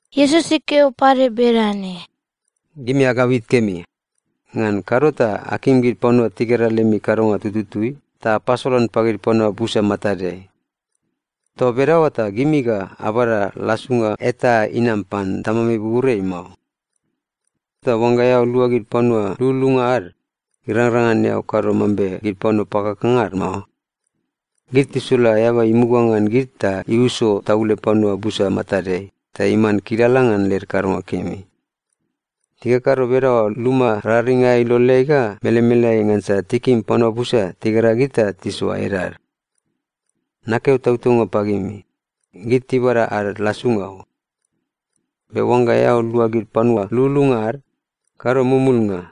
Iesus ikeo pade bedane, “Gimi agabit kemi. Ngan kado ta akim gid panua tigera lemi kadonga tututui ta apasolan pagid panua busa matadeai. Toa bedaoa ta gimi ga abada lasunga eta inam pan Tamami buburiai mao. “Ta oangga eao lua gid panua lululunga ad, irangrang ngan eao kado mambe gid panua pakakanga ad mao. Gid tisula eaba imuga ngan gid ta iuso taule panua busa matadeai ta iman kilala ngan led kadonga kemi. Tikakado bedaoa luma raring aea iloleai ga melemeleai ngansa tikim panua busa tigera gid ta tisoa edad. Nakeo tautaunga pagimi, gid tibada ad lasunga o. Be oangga eao lua gid panua lululunga ad, kado mumulnga,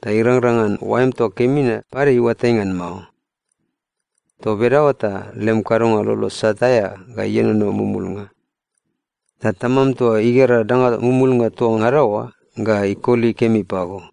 ta irangrang ngan oaem toa kemi na pade iuatai ngan mao. Toa bedaoa ta lem kadonga lolo isat aea ga ienono mumulnga. Ta Tamam toa igera danga mumulnga toa ngada oa ga ikoli kemi pago.”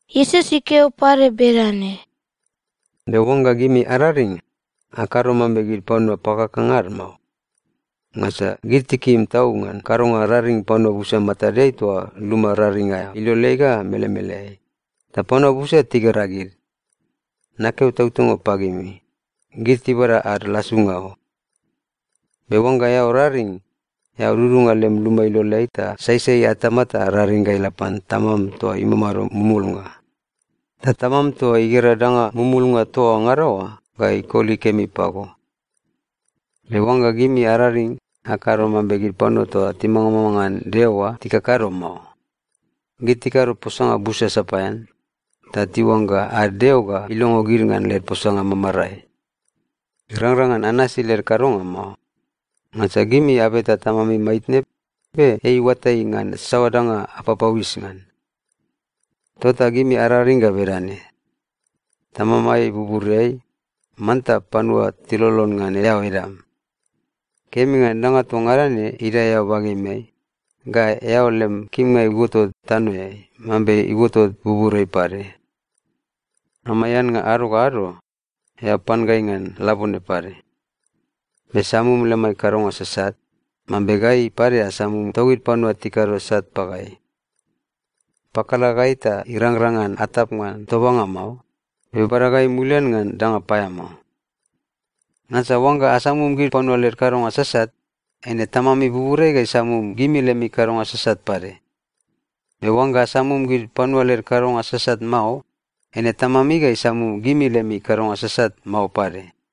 Iesus ikeo pade bedane, “Be oangga gimi araring, akado mambe gid panua pakakanga ad mao. Ngansa gid tikim tau ngan kadonga raring panua busa matadeai toa luma raring aea iloleai ga melemeleai, ta panua busa tigera gid. Nakeo tautaunga pagimi, gid tibada ad lasunga o. Be oangga eao raring, eao dudunga lem luma iloleai ta saisai atama ta raring ga ila pan Tamam toa imamado mumulnga. Ta Tamam toa igera danga mumulnga toa ngada oa ga ikoli kemi pago. “Be oangga gimi araring, akado mambe gid panua toa timangamanga ngan Deo oa tikakado mao. Gid tikado posanga busa sapaean, ta tiuangga ad deo ga ilongo gid ngan led posanga mamarae. Irangrang ngan anasi led kadonga mao. Ngansa gimi abeta Tamami maitne, be ei iuatai ngan saoa danga apapauis ngan. “Tota gimi araring ga bedane, “‘Tamamai buburiai, manta panua tilolon ngan eao edam. Kemi ngan danga toa ngada ne idae eao bagemeai, ga eao lem kimnga iuotot tanoeai mambe iuotot buburiai pade. Amai annga ado ga ado, eao pan gai ngan labone pade. Be samum lemai kadonga sasat, mambe gai pade asamum togid panua tikado sat pagai. Pakala gai ta irangrang ngan atap ngan tobanga mao, be bada gai mulian ngan danga paeamao.’ Ngansa oangga asamum gid panua led kadonga sasat, eine Tamami buburiai ga isamum gimi lemi kadonga sasat pade. Be oangga asamum gid panua led kadonga sasat mao, eine Tamami ga isamum gimi lemi kadonga sasat mao pade.”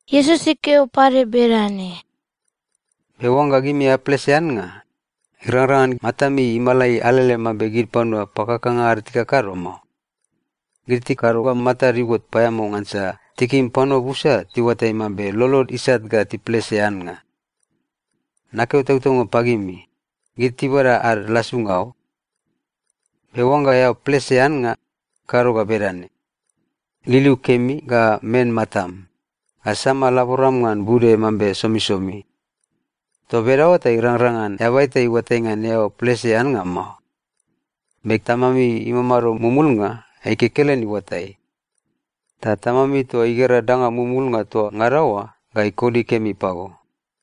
Iesus ikeo pade bedane, “Be oangga gimi aplese annga, irangrang ngan matami imalai alele mambe gid panua pakakanga ad tikakado mao. Gid tikado ga matad iuot paeamao ngansa tikim panua busa tiuatai mambe lolod isat ga tiplese annga. Nakeo tautaunga pagimi, gid tibada ad lasunga o. Be oangga eao plese annga, kado ga bedane: liliu kemi, ga men matam, ga sama laboram ngan bude mambe somisomi. Toa bedaoa ta irangrang ngan eaba eta iuatai ngan eao plese annga mao. Be Tamami imamado mumulnga, ei kekelen iuatai. Ta Tamami toa igera danga mumulnga toa ngada oa ga ikoli kemi pago.”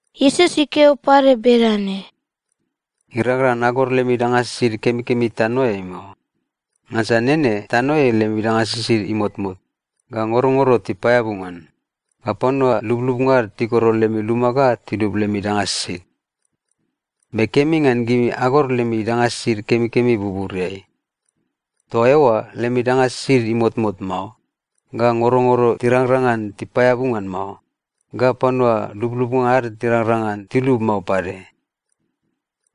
Iesus ikeo pade bedane, “Irangrang ngan agor lemi danga sisid kemikemi tanoeai mao. Ngansa nene tanoeai lemi danga sisid imotmot, ga ngorongoro tipaeabu ngan, ga panua lublubnga ad tigoro lemi luma ga tilub lemi danga sisid. Be kemi ngan gimi agor lemi danga sisid kemikemi buburiai. Toa eoa lemi danga sisid imotmot mao, ga ngorongoro tirangrang ngan tipaeabu ngan mao, ga panua lublubnga ad tirangrang ngan tilub mao pade.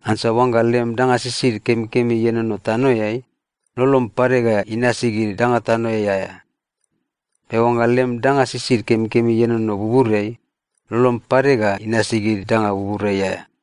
Ngansa oangga lem danga sisid kemikemi ienono tanoeai, lolom pade ga inasi gid danga tanoeai aea. Be oangga lem danga sisid kemikemi ienono buburiai, lolom pade ga inasi gid danga buburiai aea.”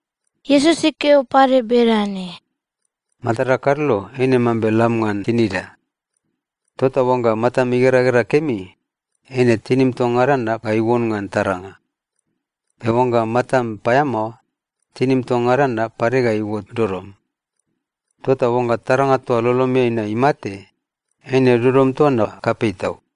Iesus ikeo pade bedane, “Matada kadlo eine mambe lam ngan tinida. Tota oangga matam igeragera kemi, eine tinim toa ngada na ga iuon ngan taranga. Be oangga matam paeamao, tinim toa ngada na pade ga iuot dodom. Tota oangga taranga toa lolomeai na imate, eine dodom toa na kapei tau!”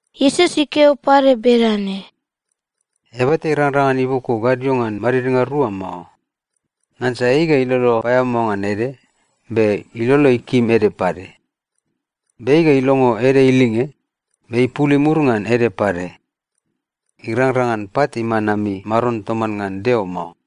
Iesus ikeo pade bedane, “Eaba eta irangrang ngan iboko gadio ngan madidnga rua mao. Ngansa ei ga ilolo paeamao ngan ede, be ilolo ikim ede pade. Be ei ga ilongo ede ilinge, be ipul imur ngan ede pade. Irangrang ngan pat iman ami maron toman ngan Deo mao.”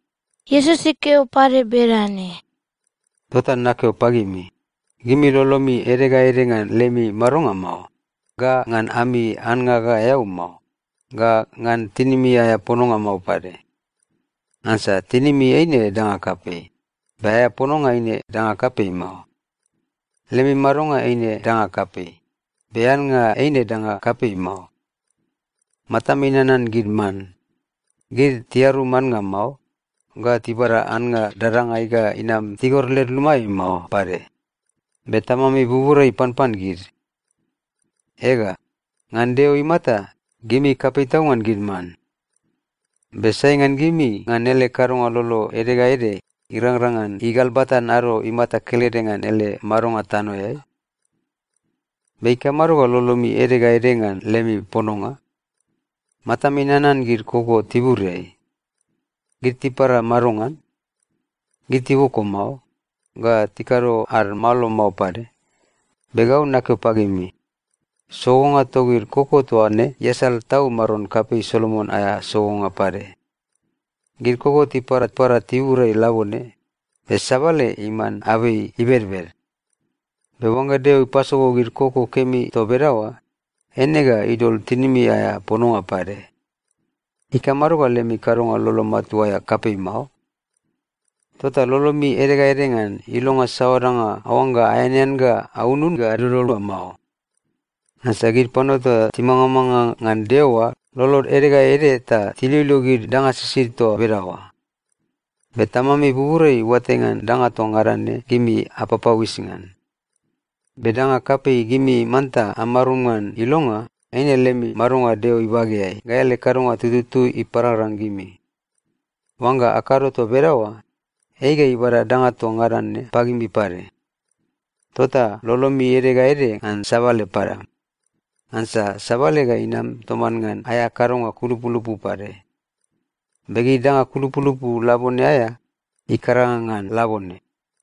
Iesus ikeo pade bedane, “Tota nakeo pagimi, gimi lolomi ede ga ede ngan lemi madonga mao, ga ngan ami annga ga eau mao, ga ngan tinimi aea pononga mao pade. Ngansa tinimi eine danga kapei, be aea pononga eine danga kapei mao. Lemi madonga eine danga kapei, be annga eine danga kapei mao. Matami nanan gid man. Gid tiarum annga mao, ga tibada annga dadangai ga inam tigor led lumaeai mao pade. Be Tamami buburiai ipanpan gid. Ega, ngan Deo imata, gimi kapei tau ngan gid man. Be sai ngan gimi ngan ele kadonga lolo ede ga ede irangrang ngan igalbatan ado imata kelede ngan ele madonga tanoeai? “Be ikamado ga lolomi ede ga ede ngan lemi pononga? Matami nanan gid koko tiburiai. Gid tipara madongan? Gid tiboko mao, ga tikado ad malo mao pade. Be gau nakeo pagimi, sogonga togid koko toa ne iasal tau maron kapei Solomon aea sogonga pade. Gid koko tiparapara tiburiai labone, be sabale iman abei ibedbed. Be oangga Deo ipasogo gid koko kemi toa bedaoa, eine ga idol tinimi aea pononga pade. Ikamado ga lemi kadonga lolo matua aea kapei mao? Tota lolomi ede ga ede ngan ilonga saoa danga aoangga aeanean ga aunun oa mao. Ngansa gid panua toa timangamanga ngan Deo oa lolod ede ga ede ta tiloilo gid danga sisid toa bedaoa. Be Tamami buburiai iuatai ngan danga toa ngada ne gimi apapauis ngan. Be danga kapei gimi manta amarum ngan ilonga, eine lemi madonga Deo ibageai ga ele kadonga tutui iparangrang gimi. Oangga akado toa bedaoa, ei ga ibada danga toa ngada ne pagimi pade. Tota lolomi ede ga ede ngan sabale padam. Ngansa sabale ga inam toman ngan aea kadonga kulupulupu pade. Be gid danga kulupulupu labone aea, ikaranga ngan labone.”